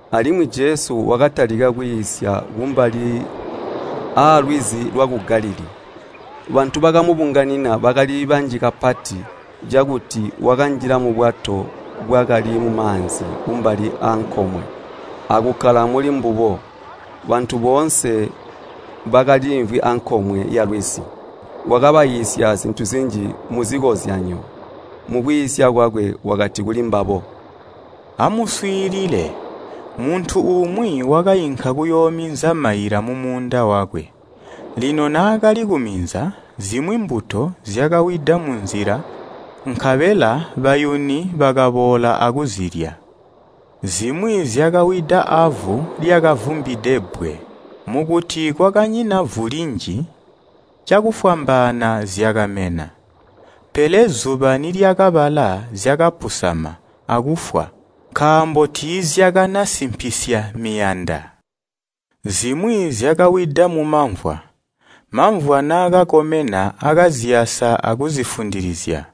Alimwi Jesu wakatalika kwiisya kumbali aalwizi lwaku Galilii. Bantu bakamubunganina bakali banji kapati, cakuti wakanjila mubwato bwakali mumaanzi kumbali aankomwe, akukkala mulimbubo. Bantu boonse bakaliimvwi ankomwe yalwizi. Wakabaiisya zintu zinji muzikozyanyo. Mukwiisya kwakwe wakati kulimbabo. “Amuswiilile, muntu umwi wakainka kuyoominza maila mumuunda wakwe. Lino naakali kuminza, zimwi mbuto zyakawida munzila nkabela bayuni bakaboola akuzilya. Zimwi zyakawida avu lyakavumbide bbwe. Mukuti kwakanyina vu linji, cakufwambaana zyakamena. Pele zuba nilyakabala zyakapusama, akufwa, nkaambo tiizyakanasimpisya miyanda. Zimwi zyakawida mumamvwa, mamvwa naakakomena akaziyasa akuzifundilizya,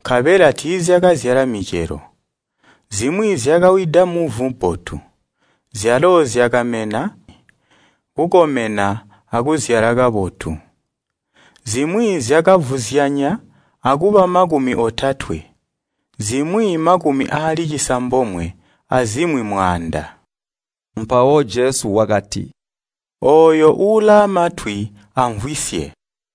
nkabela tiizyakazyala micelo. Zimwi zyakawida muvu bbotu, zyalo zyakamena, kukomena akuzyala kabotu. Zimwi zyakavuzyanya akuba makumi otatwe, zimwi makumi aali cisambomwe, azimwi mwaanda.” Mpawo Jesu wakati, “Ooyo ulaamatwi amvwisye!”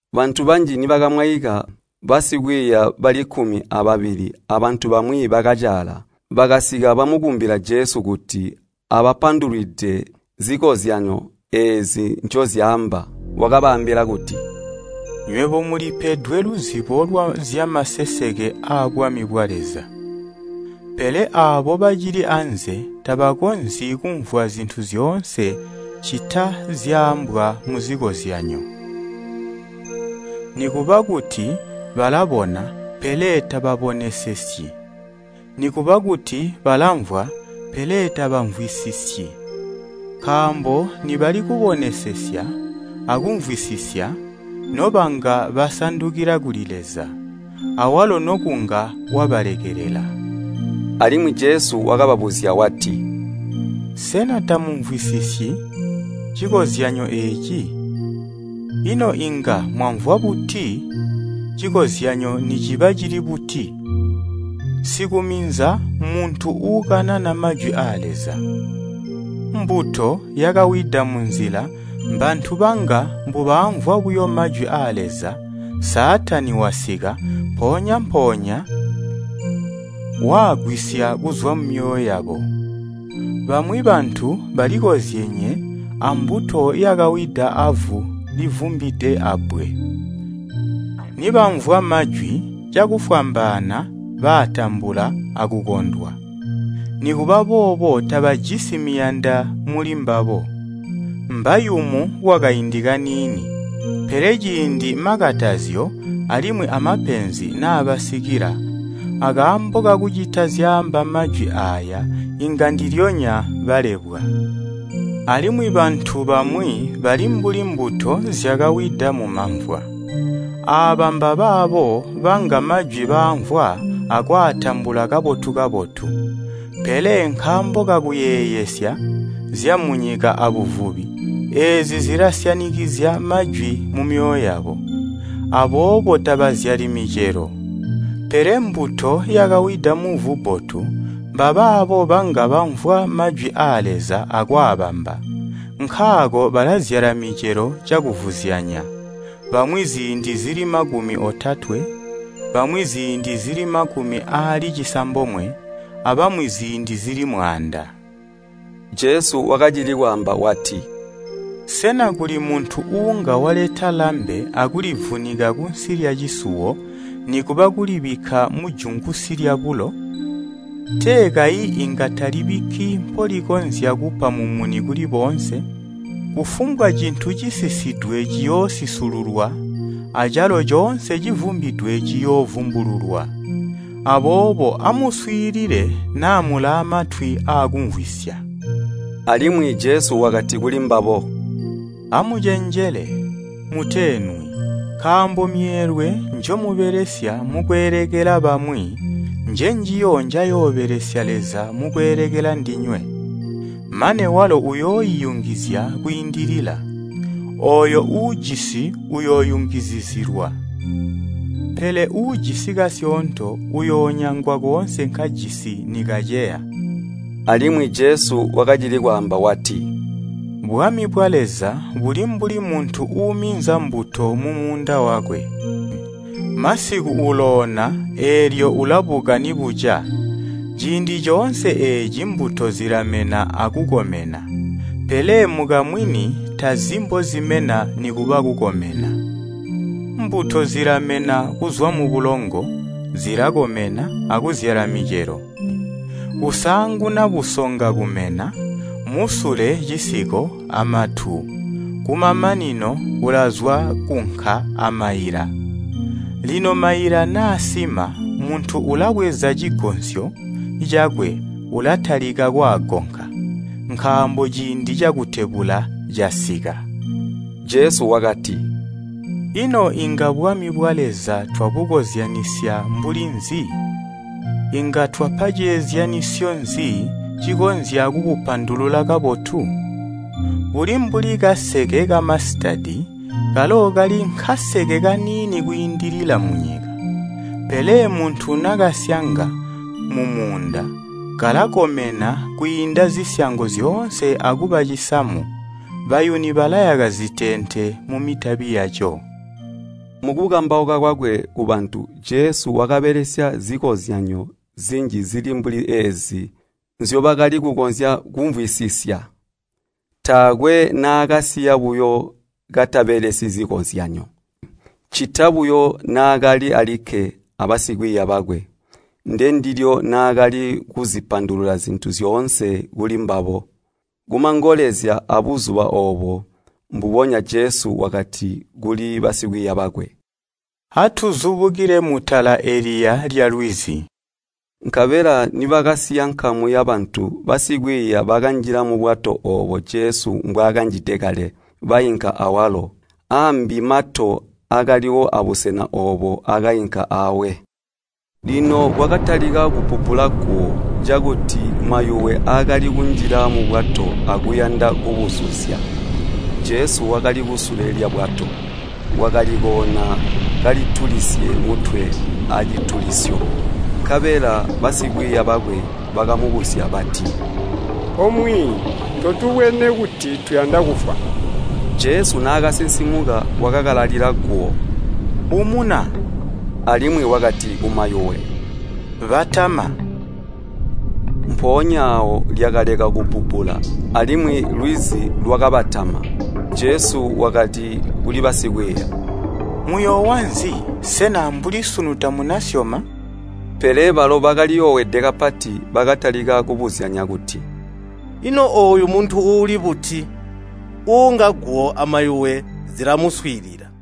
Bantu banji nibakamwaika, basikwiiya bali kkumi ababili abantu bamwi bakacaala, bakasika bamukumbila Jesu kuti abapandulwide zikozyanyo eezi ncozyaamba. Wakabaambila kuti, “Nywebo mulipedwe luzibo lwa zyamaseseke aabwami bwa Leza. Pele aabo bacili anze tabakonzyi kumvwa zintu zyoonse ccita zyaambwa muzikozyanyo. Nikuba kuti, ‘Balabona, pele tababonesesyi, nikuba kuti balamvwa, pele tabamvwisisyi. Nkaambo nibali kubonesesya a kumvwisisya, nobanga basandukila kuli Leza, awalo nokunga wabalekelela.’” Alimwi Jesu wakababuzya wati, “Sena tamumvwisisyi cikozyanyo eeci? Ino inga mwamvwa buti cikozyanyo niciba cili buti? Sikuminza mmuntu uukanana majwi aa Leza. Mbuto yakawida munzila mbantu banga mbubaamvwa buyo majwi aa Leza, Saatani wasika, mpoonya-mpoonya waagwisya kuzwa mumyoyo yabo. Bamwi bantu balikozyenye ambuto yakawida avu livumbide abbwe. Nibamvwa majwi, cakufwambaana baatambula akukondwa. Nikuba boobo tabajisi miyanda mulimbabo, mbayumu kwakaindi kaniini, pele ciindi makatazyo alimwi amapenzi naabasikila akaambo kakucita zyaamba majwi aaya inga ndilyonya balebwa. Alimwi bantu bamwi bali mbuli mbuto zyakawida mumamvwa. Aaba mbabaabo banga majwi baamvwa akwaatambula kabotu-kabotu, pele nkaambo kakuyeeyesya zyamunyika abuvubi, eezi zilasyanikizya majwi mumyoyo yabo. Aboobo tabazyali micelo. Pele mbuto yakawida muvu bbotu mbabaabo banga bamvwa majwi aa Leza akwaabamba, nkaako balazyala micelo cakuvuzyanya, bamwi ziindi zili makumi otatwe, bamwi ziindi zili makumi aali cisambomwe, abamwi ziindi zili mwaanda.” Jesu wakacili kwaamba wati, “Sena kuli muntu uunga waleta lambe akulivunika kunsi lyacisuwo nikuba kulibikka mujungusi lyabulo? Tee kayi inga talibikki mpolikonzya kupa mumuni kuli boonse? Kufumbwa cintu cisisidwe ciyoosisululwa acalo coonse civumbidwe ciyoovumbululwa. Aboobo amuswiilile naa mulaamatwi aakumvwisya!” Alimwi Jesu wakati kulimbabo, “Amucenjele, muteenwi! Nkaambo myeelwe njomubelesya mukweelekela bamwi njenjiyo njayoobelesya Leza mukweelekela ndinywe, mane walo uyooiyungizya kwiindilila. Ooyo uujisi uyooyungizizilwa, pele uujisi kasyoonto uyoonyangwa koonse nkajisi nikaceya.” Alimwi Jesu wakacili kwaamba wati, “Bwami bwa Leza buli mbuli muntu uuminza mbuto mumuunda wakwe. Masiku uloona eelyo ulabuka nibuca, ciindi coonse eeci mbuto zilamena akukomena. Pele mukamwini tazi mbozimena nikuba kukomena. Mbuto zilamena kuzwa mubulongo, zilakomena akuzyala micelo, kusaanguna busonga kumena, musule cisiko amatu kumamanino kulazwa kkunka amaila. Lino maila naasima muntu ulabweza cigonsyo cakwe ulatalika kwaagonka, nkaambo ciindi cakutebula casika.” Jesu wakati, “Ino inga bwami bwa Leza twabukozyanisya mbuli nzi? Inga twapa ceezyanyisyo nzi cikonzya kubupandulula kabotu? Buli mbuli kaseke kamasitadi kalo kali nkaseke kaniini kwiindilila munyika. Pele muntu nakasyanga mumuunda, kalakomena kwiinda zisyango zyoonse akuba cisamu, bayuni balayaka ziteente mumitabi yaco.” Mukukambauka kwakwe kubantu, Jesu wakabelesya zikozyanyo zinji zili mbuli eezi nzyobakali kukonzya kumvwisisya. Taakwe naakaiisya buyo katabelesyi zikozyanyo, ccita buyo naakali alikke abasikwiiya bakwe, ndendilyo naakali kuzipandulula zintu zyoonse kulimbabo. Kumangolezya aabuzuba oobo mbubonya Jesu wakati kuli basikwiiya bakwe, “Atuzubukile mutala eliya lyalwizi.” Nkabela nibakasiya nkamu yabantu, basikwiiya bakanjila mubwato oobo Jesu mwaakanjide kale, bainka awalo. Aambi mato akaliwo abusena oobo akainka aawe. Lino kwakatalika kubbubbula guwo, cakuti mayuwe akali kunjila mubwato akuyanda kubuzuzya, Jesu wakali kusule lyabwato. Wakali koona kalitulisye mutwe acilitulisyo. Nkabela basikwiiya bakwe bakamubusya bati, “O Mwiiyi, totubwene kuti tuyanda kufwa?” Jesu naakasinsimuka wakakalalila guwo, “Umuna!” Alimwi wakati kumayuwe, “Batama!” Mpoonya aawo lyakaleka kubbubbula, alimwi lwizi lwakabatama. Jesu wakati kuli basikwiiya, “Muyoowa nzi? Sena ambuli sunu tamunasyoma?” Pele balo bakaliyoowede kapati, bakatalika kubuzyanya kuti, “Ino ooyu muntu uuli buti? Uunga guwo amayuwe zilamuswiilila.”